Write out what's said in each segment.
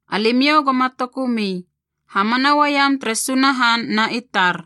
“Alimiou goma tokumi. Hamana uaiam tere Sunahan na i tar.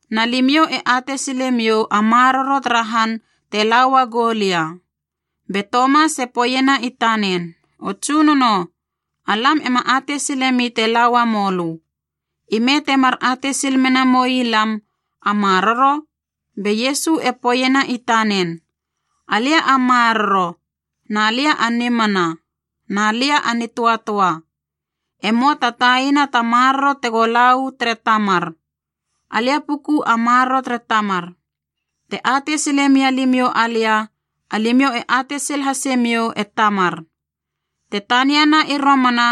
Na limiou e atei silemiou a maroro tara han te la uagou lia.” Be Tomas e poeiena i tanen, “O Tsunono, alam ema atei silemi te la uamou lö. Ime temar atei sil mena moi lam a maroro?” Be Iesu e poeiena i tanen, “Alia a maroro, na lia a nimana, na lia a nitöatöa. E möa ta taiana ta maroro tego la u tere Tamar. Alia puku a maroro tere Tamar. Te atei sile mia limiou alia, alimiou e atei sil hasemiou e Tamar. Te taniana i romana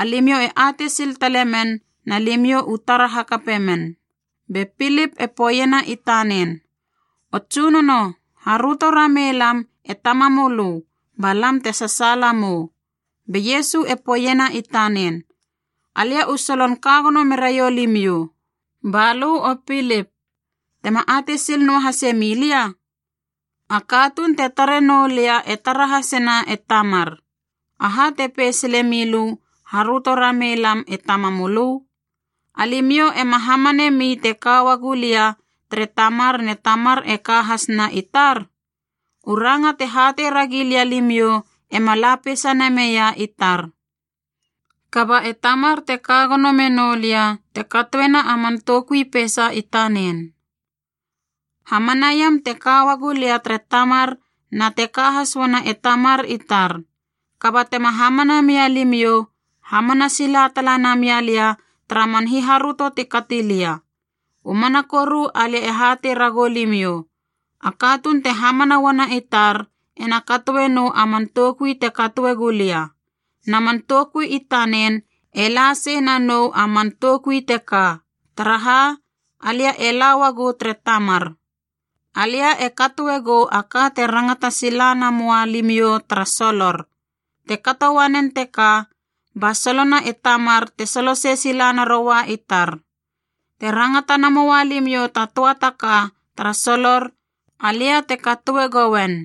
alimiou e atei sil tale men na limiou u tara hakape men.” Be Pilip e poeiena i tanen, “O Tsunono, haröto ramei lam e Tamamölö, ba lam te sasaala mou.” Be Iesu e poeiena i tanen, “Alia u solon ka gono meraiou limiou. Ba lö, o Pilip, tema atei sil noahase milia? A katuun te tare noulia e tara hasena e Tamar. Aha te pei sile milö, ‘Haröto ramei lam e Tamamölö?’ Alimiou ema hamanami te ka uagu lia tere Tamar ne Tamar e ka has na i tar? U ranga te hatei ragi lia limiou ema la peisa nameia i tar. Kaba e Tamar te ka gono menoulia te katoena a man toukui peisa i tanen. Hamanaiam te ka uagu lia tere Tamar na te ka has uana e Tamar i tar. Kaba tema hamana mia limiou, hamana sila tala namia lia tara man hiharöto ti kati lia. U mana koru alia e hatei ragou limiou, a katuun te hamana uana i tar ena katoe nou a man toukui te katoe gulia. Na man toukui i tanen e la sei na nou a man toukui teka, taraha alia e la uagu tere Tamar. Alia e katoe gou a ka te rangata sila namoa limiou tara solor, te kato uanen teka ba solona e Tamar te solosei sila naroua i tar. Te rangata namoua limiou ta töa ta ka tara solor, alia te katoe gouen.”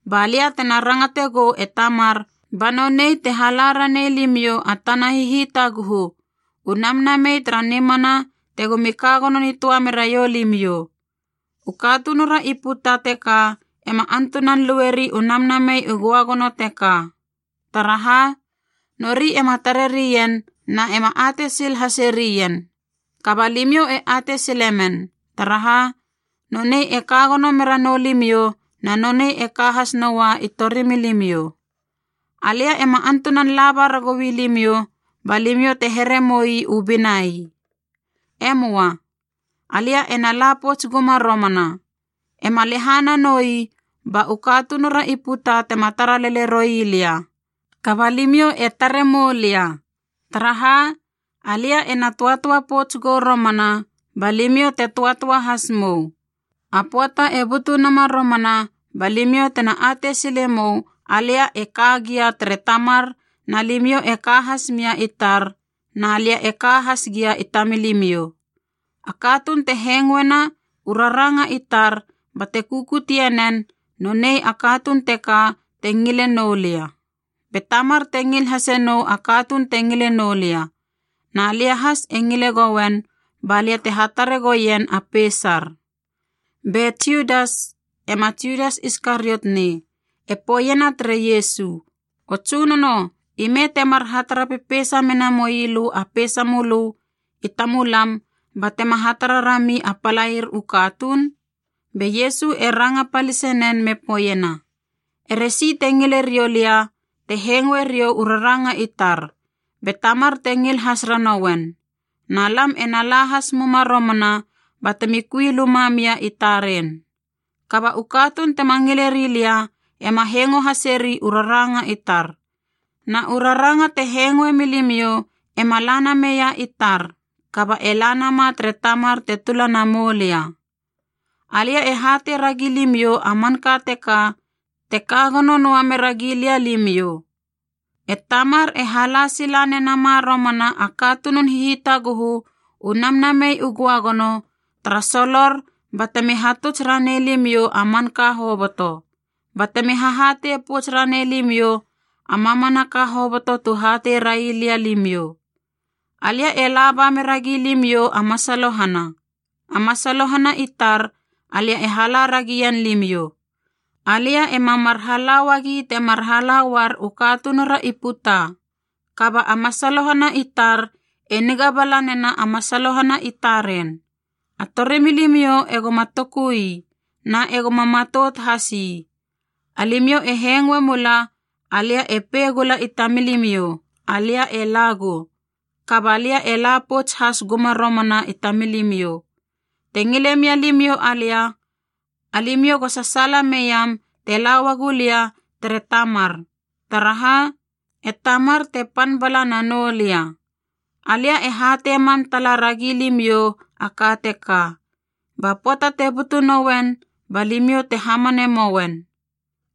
Ba lia tena rangate gou e Tamar ba nonei te hala ranei limiou a tana Hihitaguhu, u Namnamei tara nimana tegomi ka gono nitöa meraiou limiou. U katunura i puta teka ema antunan lueri u Namnamei u Göagono teka, taraha nori ema tare rien na ema atei sil hase rien. Kaba limiou e atei sile men, taraha nonei e ka gono mera noulimiou na nonei e ka has noua i torimilimiou. “Alia ema antunan laba ragoui limiou ba limiou te here moi u binai. E möa. Alia ena la pouts guma romana. Ema lehana noi ba u katunura i puta tema tara lele roi lia, kaba limiou e tare moulia. Taraha, alia ena töatöa pouts gou romana ba limiou te töatöa has mou. A pöata e butu nama romana ba limiou tena atei sile mou alia e ka gia tere Tamar na limiou e ka has mia i tar na lia e ka has gia i tamilimiou. A katuun te hengoena u raranga i tar bate kukutie nen, nonei a katuun teka te ngile noulia. Be Tamar te ngil hase nou a katuun te ngile noulia, na lia has e ngile gouen ba lia te hatare goien a peisar.” Be Judas (ema Judas Iskariot nei) e poeiena tere Iesu, “O Tsunono, ime temar hatara pepeisa mena moilö a peisamölö i tamulam batema hatara rami a palair u katuun?” Be Iesu e ranga palisenen me poeiena, “Ere si te ngile riou lia te hengoe riou u raranga i tar, be Tamar te ngil has ranouen, na lam ena la has muma romana batemi kui luma mia i taren. Kaba u katuun tema ngileri lia ema hengo haseri u raranga i tar, na u raranga te hengoe milimiou ema la nameia i tar, kaba e la nama tere Tamar te tula namou lia. “Alia e hatei ragi limiou a manka teka te ka gono noa mera gilia limiou. E Tamar e hala sila nenama romana a katunun hihitaguhu, u Namnamei u Göagono, tara solor batemi hatuts ranei limiou a manka hoboto, batemi hahatei pouts ranei limiou a mamanaka hoboto tu hatei rai lia limiou. “Alia e laba meragi limiou a masalohana, a masalohana i tar alia e hala ragien limiou. Alia ema mar hala uagi temar hala uar u katunura i puta. Kaba a masalohana i tar e niga bala nena a masalohana i taren. A torimilimiou egoma toku ii na egoma matout has ii. Alimiou e hengoe mula alia e pei gula i tamilimiou, ‘Alia e lagou, kaba lia e la pouts has guma romana i tamilimiou.’ Te ngile mia limiou alia, alimiou go sasaala meiam te la uagu lia tere Tamar, taraha e Tamar te pan bala nanou lia. Alia e hatei mam tala ragi limiou a ka teka, ba pöata te butu nouen ba limiou te hamane mouen.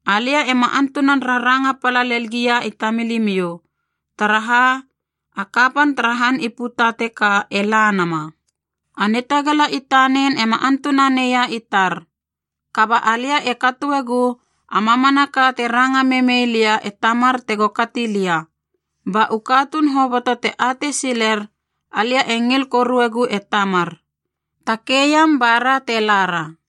Alia ema antunan raranga pala lel gia i tamilimiou, taraha a kapan tara han i puta teka e la nama. A nitagala i tanen ema antuna neia i tar. Kaba alia e katoegu a mamanaka te ranga memei lia e Tamar tego kati lia, ba u katuun hoboto te atei siler alia e ngil koruegu e Tamar. “Takeiam, bara te lara.”